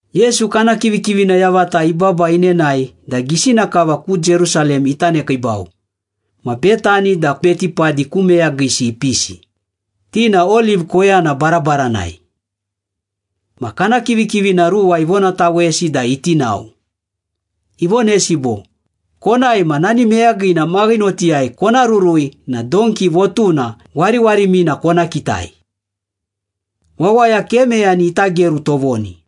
Yesu kana kivikivina yavata ibaba inenae da gisina kava ku Jerusalem ita nekiibau, ma Betani da Betipadi ku meyagisi ipisi, ti na Oliv koyana barabaranai. Ma kana kivikivina ruwa ivonatawesi da iti nao. Ivonesi bo, “Konae, ma nani meyagina maghinotai kona rurui na donki votuna wariwarimina kona kitai. Wawaya ke meyani ita geru tovoni.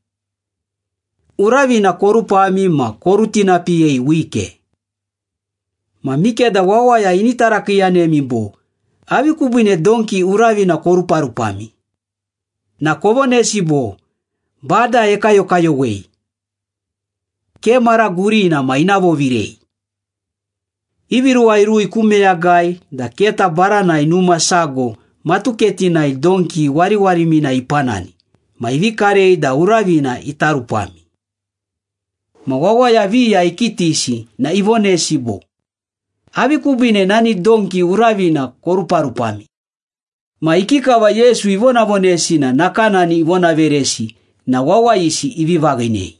Uravina korupami ma korutinapiyei wike. Ma mikeda wawaya ini tarakiiyanemi bo, ‘Avi kubiine donki uravina koruparupami?’ na kovonesi bo, ‘Bada ekayokayowei. Ke mara gurina ma ina vovirei.’” Ivi ruwa irui ku meyagai da keta baranai numa sago matuketinai donki wariwarimina ipanani ma ivi karei da uravina ita rupami. Ma wawaya viya ikitisi na ivonesi bo, “Avi kubiine nani donki uravina koruparupami?” Ma ikikava Yesu ivonavonesi na nakanani ivonaveresi na wawayisi ivi vaghinei.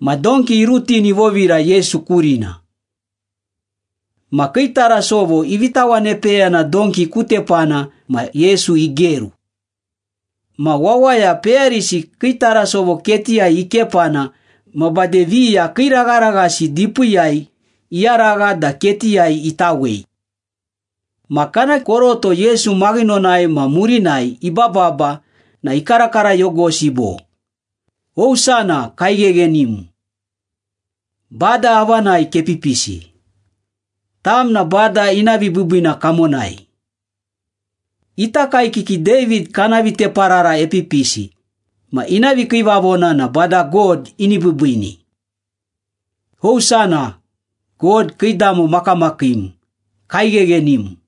Ma donki irutini ivovira Yesu kurina. Ma kii tarasovo ivi tawanepeyana donki ku tepana ma Yesu igeru. Ma wawaya peyarisi kii tarasovo ketiyai ikepana ma bade viya kiiragharaghasi dipiiyai iyaragha da ketiyai itawei. Ma kana koroto Yesu maghinonai ma murinai ibababa na ikarakarayogosi bo, “Hosana! Kaigheghenim! Bada avanai kepipisi! Tam na Bada ina vibiibiina kamonai! Ita kaekiki David kana viteparara epipisi ma ina vikiivavona na Bada God ini biibiini! Hosana! God, kiidamo makamakiim, kaigheghenim!”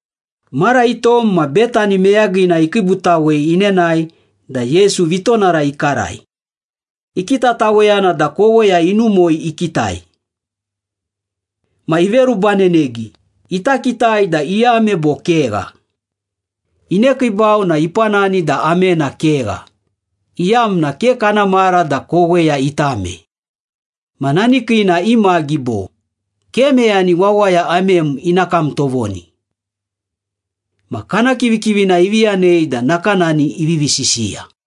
Mara itom ma Betani meyagina ikiibutawei inenae da Yesu vitonara ikarai. Ikitataweyana da koweya inumoi ikitai. Ma iverubanenegi, ita kitai da iame bo kegha. Inekiibau na ipanani da amena kegha, iyamna ke kana mara da koweya itame. Ma nani kiina imagi bo, “Ke meyani wawaya amem ina kam tovoni.” Ma kana kivikivina ivi yanei da nakanani ivivi sisiya.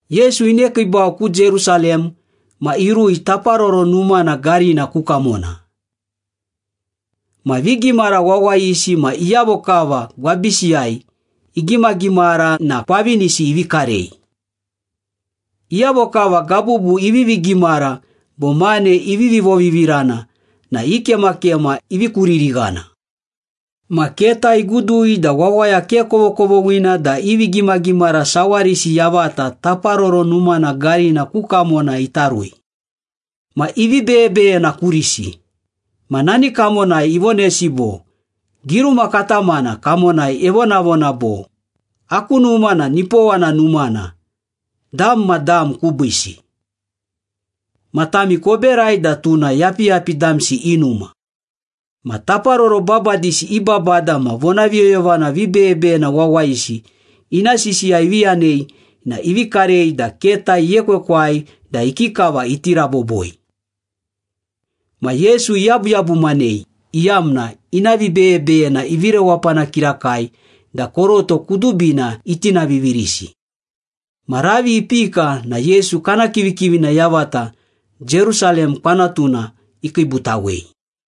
Yesu inekiibau ku Jerusalem ma irui Taparoro Numana garina ku kamona. Ma vigimara wawayisi ma iyavo kava gwabisiyai igimagimara na kwavinisi ivi karei. Iyavo kava gabubu ivivi gimara bo mane ivivi vovivirana na i kemakema ivi kuririghana. Ma keta igudui da wawaya ke kovokovoghina da i vigimagimara sawarisi yavata Taparoro Numana garina ku kamona ita rui. Ma ivi beyebeyena kurisi, ma nani kamonai ivonesi bo, “Giruma katamana kamonai evonavona bo, ‘Aku numa na nipowana numana dam ma dam kubiisi.’ ‘Ma tami koberai da tuna yapiyapi damsi i numa.’” Ma taparoro babadisi i babada ma vonaviyoyovana vibeyebeyena wawayisi ina sisiya ivi yanei na ivi karei da keta iekwekwai da ikikava iti raboboi. Ma Yesu iyabuyabumanei iyamna ina vibeyebeyena ivi rewapana kirakai da koroto kudubina itinavivirisi. Ma ravi ipika na Yesu kana kivikivina yavata Jerusalem kwanatuna ikiibutawei.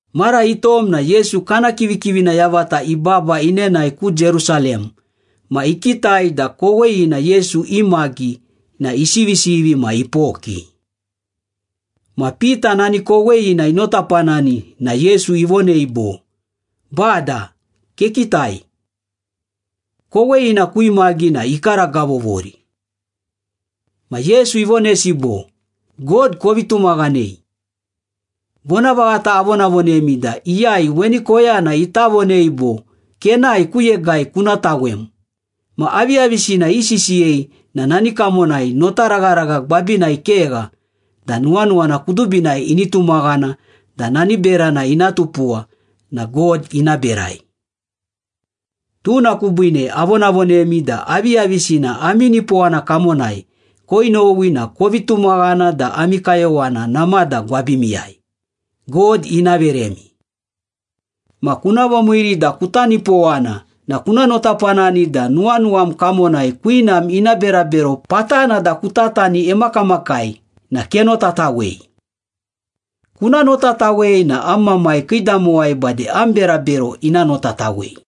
Mara itom na Yesu kana kivikivina yavata ibaba inenae ku Jerusalem ma ikitai da koweyina Yesu imagi na isivisivi ma ipoki. Ma Pita nani koweyina inotapanani na Yesu ivonei bo, “Bada, kekitai. Koweyina kuimagi na ikaragavovori.” Ma Yesu ivonesi bo, “God kovi tumaghanei. Vonavaghata avonavonemi da iyai weni koyana ita vonei bo, ‘Kenae, ku yegai kuna tawem,’ ma aviyavisina isisiyei na nani kamonai notaragharagha gwabinai kegha da nuwanuwana kudubinai ini tumaghana da nani berana ina tupuwa na God ina berai. Tuna kubiine avonavonemi da aviyavisina ami nipowana kamonai koinowi na kovi tumaghana da ami kayowana namada gwabimiyai, God ina veremi. Ma kuna vomiiri da kuta nipowana na kuna notapanani da nuwanuwam kamonai kwinam ina berabero patana da kutatani emakamakai na kenotatawei. Kuna notatawei na am Mamai kiidamowai bade am berabero ina notatawei.”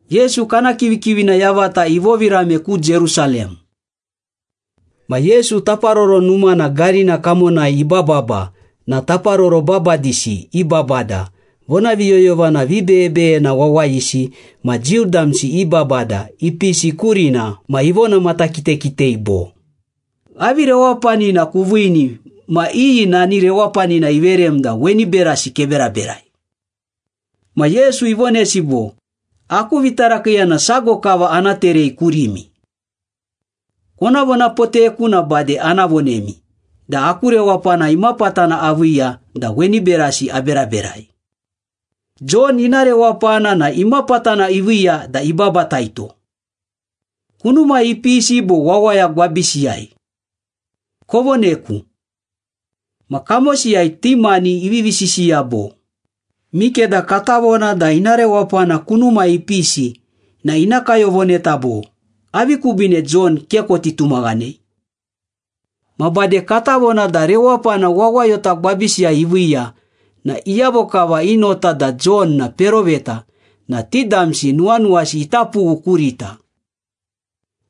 Yesu kana kivikivina yavata ivovirame ku Jerusalem. Ma Yesu Taparoro Numana garina kamonai ibababa na taparoro babadisi i babada, vonaviyoyovana vibeyebeyena wawayisi ma Jiu damsi i babada ipisi kurina ma ivonamatakitakitei bo, “Avi rewapanina kuviini ma iyi nani rewapanina iverem da weni berasi keberaberai?” Ma Yesu ivonesi bo, “Aku vitarakiiyana sago kava ana terei kurimi. Kona vonapoteku na bade ana vonemi da aku rewapana imapatana aviiya da weni berasi aberaberai. Jon ina rewapana na imapatana iviiya da ibabataito? Kunumai ipisi bo wawaya gwabisiyai? Kovoneku.” Ma kamosiyai ti mani ivivi sisiya bo, “Mikeda kata vona da ina rewapana kunumai ipisi na ina kayovoneta bo, ‘Avi kubiine Jon ke koti tumaghanei?’ Ma bade kata vona da rewapana wawayota gwabisiyai iviiya na iyavo kava i nota da Jon na peroveta na ti damsi nuwanuwasi ita pughu kurita.”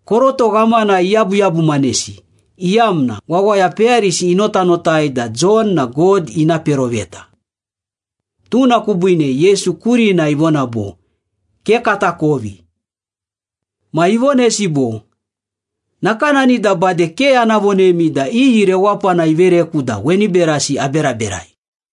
Koroto ghamana iyabuyabumanesi, iyamna wawaya peyarisi inotanotai da Jon na God ina peroveta. Tuna kubiine Yesu kurina ivona bo, “Ke katakovi.” Ma ivonesi bo, “Nakanani da bade ke ana vonemi da iyi rewapana ivereku da weni berasi aberaberai.”